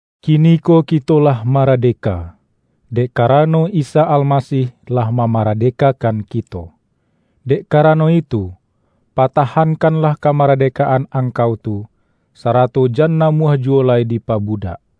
Kiniko kito lah maradeka, dek ka-rano Isa Almasih lah mamaradeka-kan kito! Dek karano itu, patahankan-lah kamaradekaan angkau tu, sarato jan namuah juwo lai dipabudak.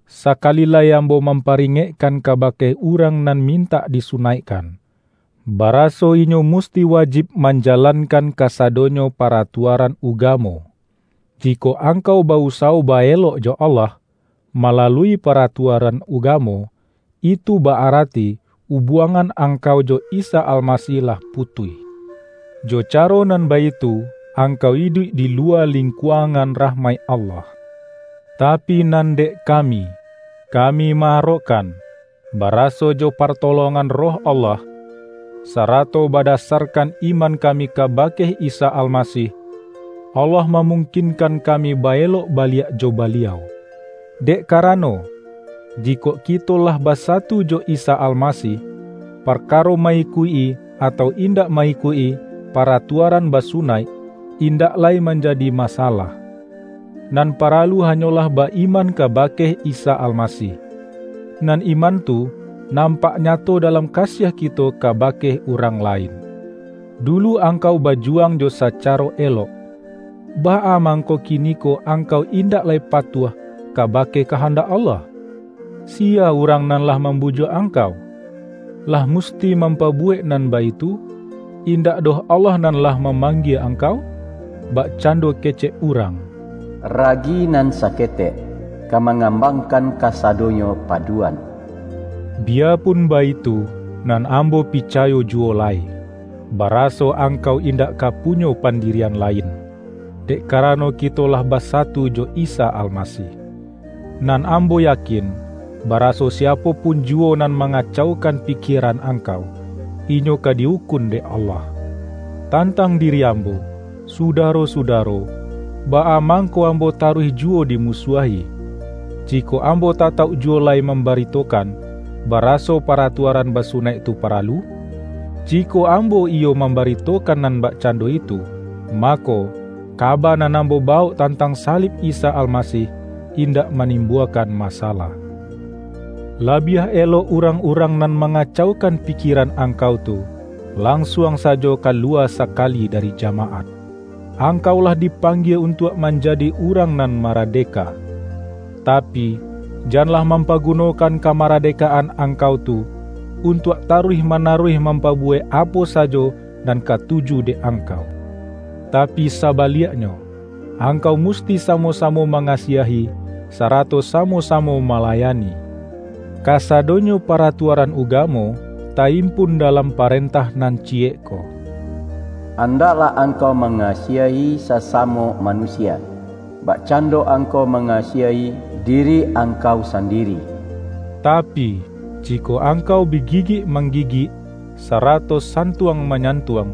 Sakali lai ambo mamparingekkan kabake urang nan mintak disunaikkan, baraso inyo musti wajib manjalankan kasadonyo paratua-ran ugamo! Jikok angkau ba-usawo ba-elok jo Allah, malalui paratuaran ugamo, itu ba-arati ubuangan ang-kau jo Isa Almasih lah putuih. Jo caro nan baitu angkau iduik di luwa ling-kuangan rahmaik Allah. Tapi nan dek kami, kami ma-arokkan, baraso jo partolongan Roh Allah, sarato bada-sarkan iman kami kabake Isa Almasih, Allah mamungkinkan kami ba-elok ba-liak jo Baliau. Dek karano, jikok ki-to lah basatu jo Isa Almasih, parkaro ma-ikuik-i atau indak ma-ikuik-i pa-ratuaran basunaik, indak lai manja-di masalah. Nan paralu hanyolah ba-iman kabake Isa Almasih, nan iman tu nampak nyato dalam kasiah kito kabake urang lain. Dulu angkau bajuwang jo sacaro elok! Baa mangko kiniko angkau indak lai patuah kabake kahandak Allah? Si-ya urang nan lah mambujuak angkau? Lah musti mampabuwek nan baitu, in-dak doh Allah nan lah mamanggie ang-kau! Bakcando kecek urang,”Ragi nan saketek, ka mangambangkan kasado-nyo paduan”. Biyapun baitu, nan am-bo picayo juwo lai, baraso angkau indak ka punyo pandirian lain, dek karano ki-to lah basatu jo Isa Almasih. Nan ambo yakin, baraso siapo pun juwo nan ma-ngacaukan pikieran angkau, inyo ka di-ukun dek Allah. Tantang diri ambo, sudaro-suda-ro, baa mangko ambo taruih juwo di-musuahi, jikok ambo tatauk juwo lai mambaritokan, baraso paratuaran ba-sunaik tu paralu? Jikok ambo iyo mam-baritokan nan bakcando itu, mako, ka-ba nan ambo bawok tantang salib Isa Almasih, indak manimbuakan masalah. Labiah elok urang-urang nan manga-caukan pikieran angkau tu, lansuang sajo kaluwa sakali dari jamaat! Angkau lah dipanggie untuak man-jadi urang nan maradeka. Tapi, janlah mampagunokan kamaradekaan angkau tu, untuak taruih manaruih mampabu-wek apo sajo nan katuju dek angkau. Ta-pi sabaliaknyo, angkau musti samo-samo mangasiahi, sarato samo-samo mala-yani. Kasadonyo paratuaran ugamo, ta-impun dalam parentah nan ciyek ko,”Andaklah angkau mangasiahi sasamo manusia, bakcando angkau mangasiahi diri angkau sandiri.” Tapi, jikok ang-kau bi gigik manggigik, sarato santuang manyantuang,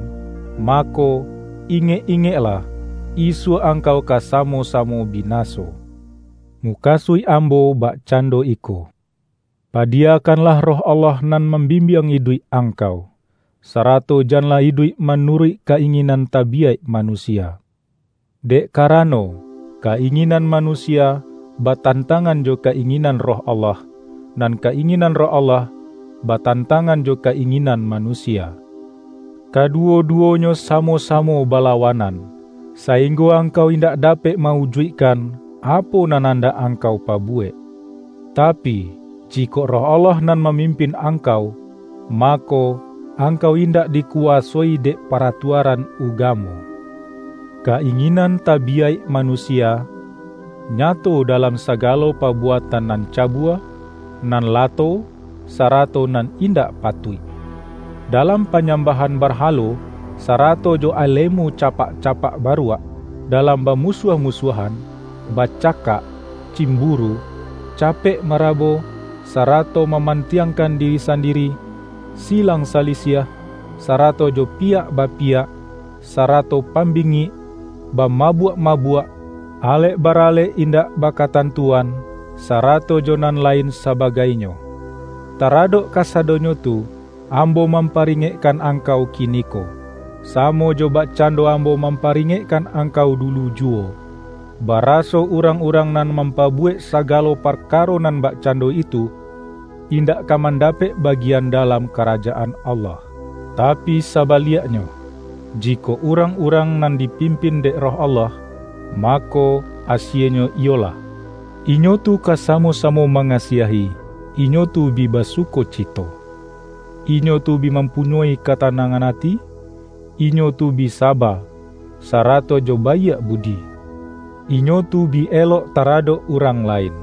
mako, ingek-ingeklah, isuak angkau ka samo-samo binaso. Mukasuik ambo bakcando iko: Pa-diyakanlah Roh Allah nan mambim-biang iduik angkau, sarato janlah iduik manuruik ka-inginan tabiyaik manusia. Dek karano, ka-inginan manusia batantangan jo ka-inginan Roh Allah, nan ka-inginan Roh Allah, batantang-an jo ka-inginan manusia. Kaduwo-du-wonyo samo-samo balawanan, sainggo angkau indak dapek ma-ujuikkan, apo nan andak angkau pabuwek. Tapi, jikok Roh Allah nan mamimpin ang-kau, mako, angkau indak dikuwasoi dek paratuaran ugamo. Ka-inginan tabiyaik manusia, nya-to dalam sagalo pabuatan nan cabua, nan lato, sarato nan indak patuik; dalam panyambahan barhalo, sa-rato jo alemu capak-capak baruak; da-lam bamusuah-musuahan, bacakak, cimburu, capek marabo, sarato ma-mantiangkan diri sandiri; silang sa-lisiah, sarato jo piyak bapiyak, sa-rato pambingik, bamabuak-mabuak, alek baralek indak bakatantuan, sa-rato jo nan lain sabagainyo. Taradok kasadonyo tu, ambo mamparingekkan angkau kiniko, samo jo bakcando am-bo mamparingekkan angkau dulu ju-wo, baraso urang-urang nan mampa-buwek sagalo parkaro nan bakcando itu, indak ka mandapek bagian dalam Karajaan Allah. Tapi sabaliaknyo, jikok urang-urang nan dipimpin dek Roh Allah, mako, asienyo iyolah: Inyo tu ka samo-samo mangasiahi, inyo tu bi basukoci-to, inyo tu bi mampunyoi katanangan ati, inyo tu bi saba, sarato jo baiak bu-di, inyo tu bi elok taradok urang lain,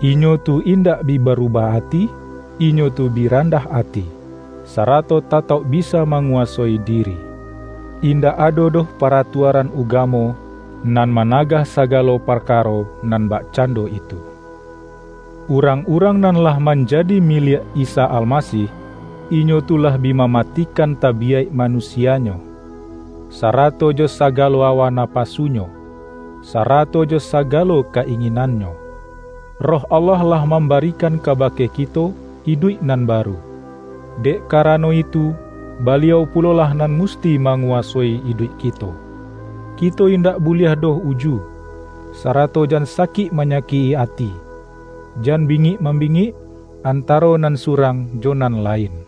inyo tu indak bi barubah ati, inyo tu bi randah ati, sarato tatauk bisa ma-nguwasoi diri. Indak ado doh paratua-ran ugamo nan managah sagalo par-karo nan bakcando itu. Urang-urang nan lah manjadi miliak Isa Almasih, inyo tu lah bi mamatikan tabiyaik ma-nusianyo, sarato jo sagalo awa napa-sunyo, sarato jo sagalo ka-inginannyo. Roh Allah lah mambarikan kabake kito iduik nan baru; dek karano itu, Baliau pulolah nan musti manguwasoi iduik kito. Kito indak buliah doh uju, sarato jan sakik manyakik-i ati, jan bingik mambingik, antaro nan su-rang jo nan lain.